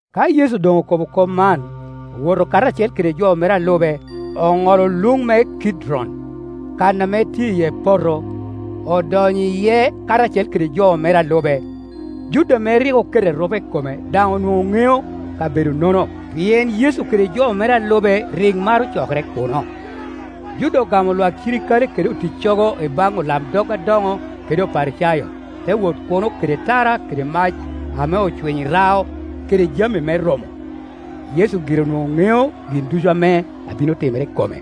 Ka Yecu doŋ okobo kop man, owoto karacel kede jo mere a lube, oŋolo luŋ me Kidron, kan ame tye iye poto; odonyo iye karacel kede jo mere a lube. Juda ame rik oketo erupe i kome daŋ onwoŋo ŋeo kabedonono, pien Yecu kede jo mere a lube rik maro cokere kuno. Juda ogamo lwak cirikale kede oticcogo i baŋ olamdog adoŋo kede Oparicayo, te wot kuno kede tara kede mac ame ocwinyo i rao kede jami me romo. Yecu gire onwoŋo ŋeo gin ducu ame abino timere i kome;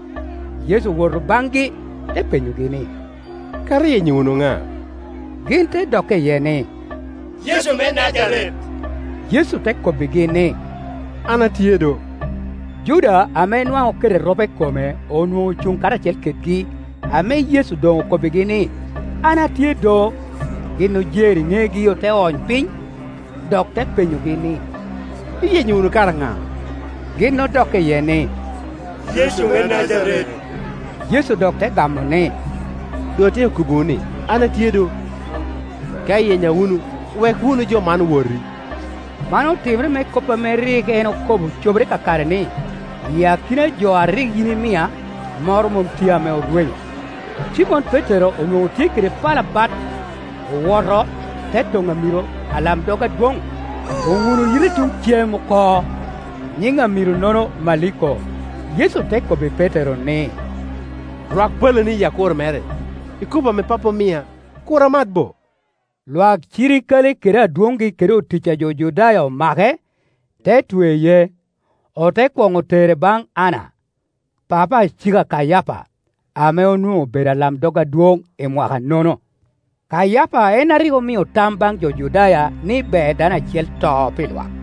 Yecu owoto baŋgi, te penyogi ni, “Kara iyenyo wunu na?” Gin te dokke iye ni, “Yecu me Najaret.” Yecu te kobbigi ni, “An atye do,” Juda ame nwaŋ oketo erupe i kome onwoŋo ocuŋ karacel kedgi. Ame Yecu doŋ okobbigi ni, “An atye do,” gin ojer i negi ote ony piny. Dok te penyogi ni, “Iyenyo wunu kara ŋa?” Gin odokke iye ni, “Yecu me Najaret.” Yecu dok te gamo ni, “Doŋ atyeko kobbiwu ni an atye do; ka iyenya wunu, wek wunu jo man woti.” Man otimere me kop ame rik en okobo cobere kakare ni, “I akina jo a rik yin imia, moro mom tye ame orwenyo.” Cimon Petero onwoŋo tye kede pala bat; owoto, te toŋo amiro alamdog adwoŋ, oljuno yite tuŋ cem oko. Nyiŋ amiro-nono, Maliko. Yecu te kobbi Petero ni, “Rwak palani i akuro mere; ikopo ame Pappa omia, kur amat bo?” Lwak cirikale kede adwoŋgi kede otic a jo Judaya omake, te tweye. Ote kwoŋo tere baŋ Anna, papa a cik a Kayapa, ame onwoŋo obedo alamdog adwoŋ imwaka-no-no. Kayapa en a rik omio tam baŋ jo Judaya ni ber dano acel to pi lwak.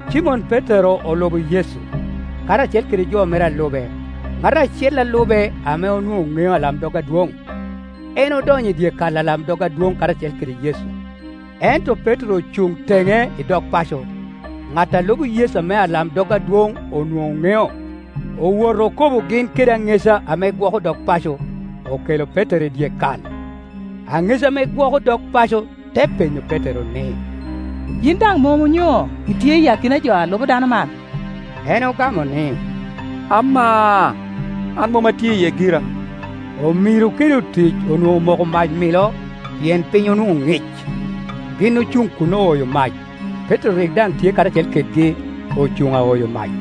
Cimon Petero olubo Yecu, karacel kede jo mere a lube. Ŋat acel a lube ame onwoŋo ŋeo alamdog adwoŋ, en odonyo i dyekal alamdog adwoŋ karacel kede Yecu, ento Petero ocuŋ teŋe i dog paco. Ŋat a lubo Yecu ame alamdog adwoŋ onwoŋo ŋeo, owoto okobo gin kede aŋeca ame gwoko dog paco, okelo Petero i dyekal. Aŋeca ame gwoko dog paco te penyo Petero ni, “Yin daŋ mom onyo itye i akina jo a lubo dano man?” En ogamo ni, “Amaa, an mom atye iye gira.” Omiro kede otic onwoŋo omoko mac milo, pien piny onwoŋo ŋic, gin ocuŋ kun ooyo mac. Petero rik daŋ tye karacel kedgi, ocuŋ aoyo mac.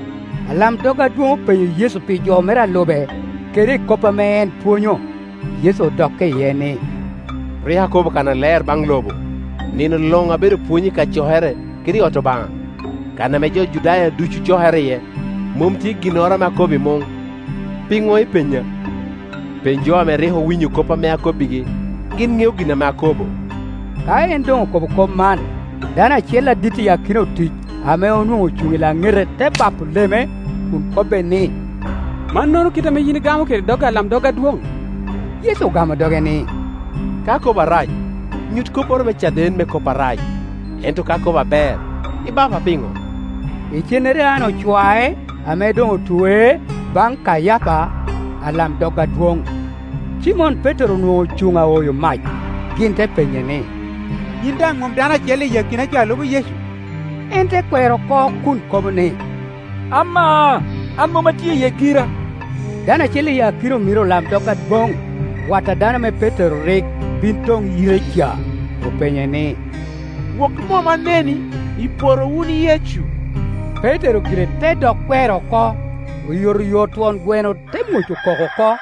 Alamdog adwoŋ openyo Yecu pi jo mere a lube, kede i kop ame en pwonyo. Yecu odokke iye ni, “Rik akobo kannaler baŋ lobo; ni no luŋ abedo pwony i kacokere kede i ot Obaŋa, kan ame jo Judaya ducu cokere iye; mom tye ginnoro ame akobo i muŋ. Pino ipenya? Peny jo ame rik owinyo kop ame akobbigi; gin ŋeo gin ame akobo.” Ka en doŋ okobo kop man, dano acel adit i akina otic ame onwoŋo ocuŋ i laŋete te ba po leme, kun kobbe ni, “Mannono kite ame yin igamo kede dog alamdog adwoŋ?” Yecu ogamo doge ni, “Ka akobo arac, nyut kopporo me caden me kop arac; ento ka akobo aber, ibapa piŋo?” Icennere Anna ocwae, ame doŋ otwee, baŋ Kayapa, alamdog adwoŋ. Cimon Petero onwoŋo ocuŋ aoyo mac. Gin te penye ni, “Yin daŋ mom dano acel i akina jo lubo Yecu?” En te kwero oko, kun kobo ni, “Amaa, an mom atye iye gira.” Dano acel i akina omiro olamdog adwoŋ, wat a dano ame Petero rik bin toŋ yite ca, openye ni, “Wok i mom aneni i poto wun i Yecu?” Petero gire te dok kwero oko; oyotoyot twon gweno te mwoco koko oko.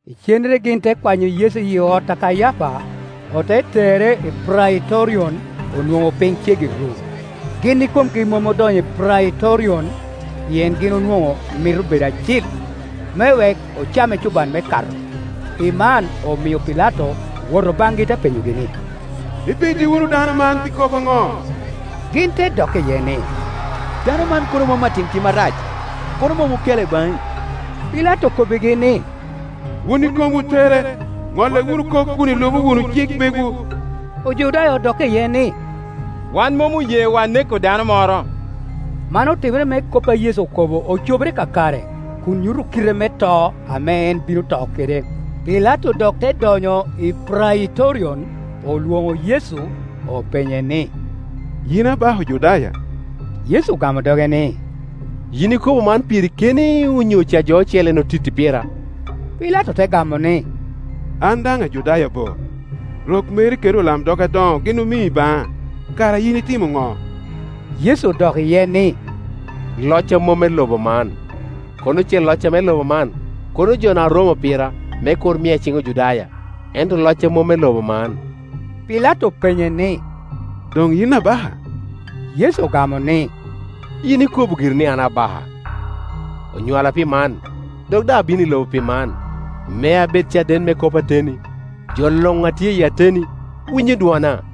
Icennere gin te kwanyo Yecu iyi ot a Kayapa, ote tere i Praitorion. Onwoŋo piny ceggi ru. Gin ikomgi mom odonyo i Praitorion, pien gin onwoŋo mito bedo acil, me wek ocam ecuban me Kato. Pi man omio Pilato owoto baŋgi, te penyogi ni, “Ipidi wunu dano man pi kop aŋo?” Gin te dokke iye ni, “Dano man kono mom atim tim arac, kono mom okele baŋi.” Pilato okobbigi ni, “Wun ikomwu tere, ŋolle wunu kop kun ilubo wunu cik megwu.” Ojudaya odokke iye ni, “Wan mom oyewa neko dano moro.” Man otimere me kop a Yecu okobo ocobere kakare, kun nyuto kite me to ame en bino to kede. Pilato dok te donyo i Praitorion, olwoŋo Yecu, openye ni, “Yin abaka Ojudaya?” Yecu ogamo doge ni, “Yin ikobo man piri keni onyo ca jo ocele en otitti pira?” Pilato te gamo ni, “An daŋ Ajudaya bo? Rok meri kede olamdog adoŋo gin omii baŋa: kara yin itimo no?” Yecu odok iye ni, “Locca mom me lobo man. Kono ce locca me lobo man, kono jona oromo pira, me kur mia i ciŋ Ojudaya; ento locca mom me lobo man.” Pilato openye ni, “Doŋ yin abaka?” Yecu ogamo ni, “Yin ikobo giri ni an abaka. Onywala pi man dok daŋ abino i lobo pi man, me abed caden me kop ateni. Jo luŋ ame tye i ateni winyo dwona.”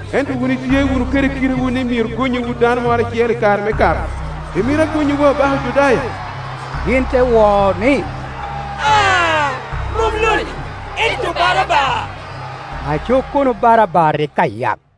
Ento wun itye wunu kede kitewu ni myero gonnyiwu dano moro acel i kare me Kato. Imito agonnyiwu abaka Ojudaya?” Gin te wo ni, “Aa, mom lo-ni, ento Barabba.” Aco kono Barabba rik ayak.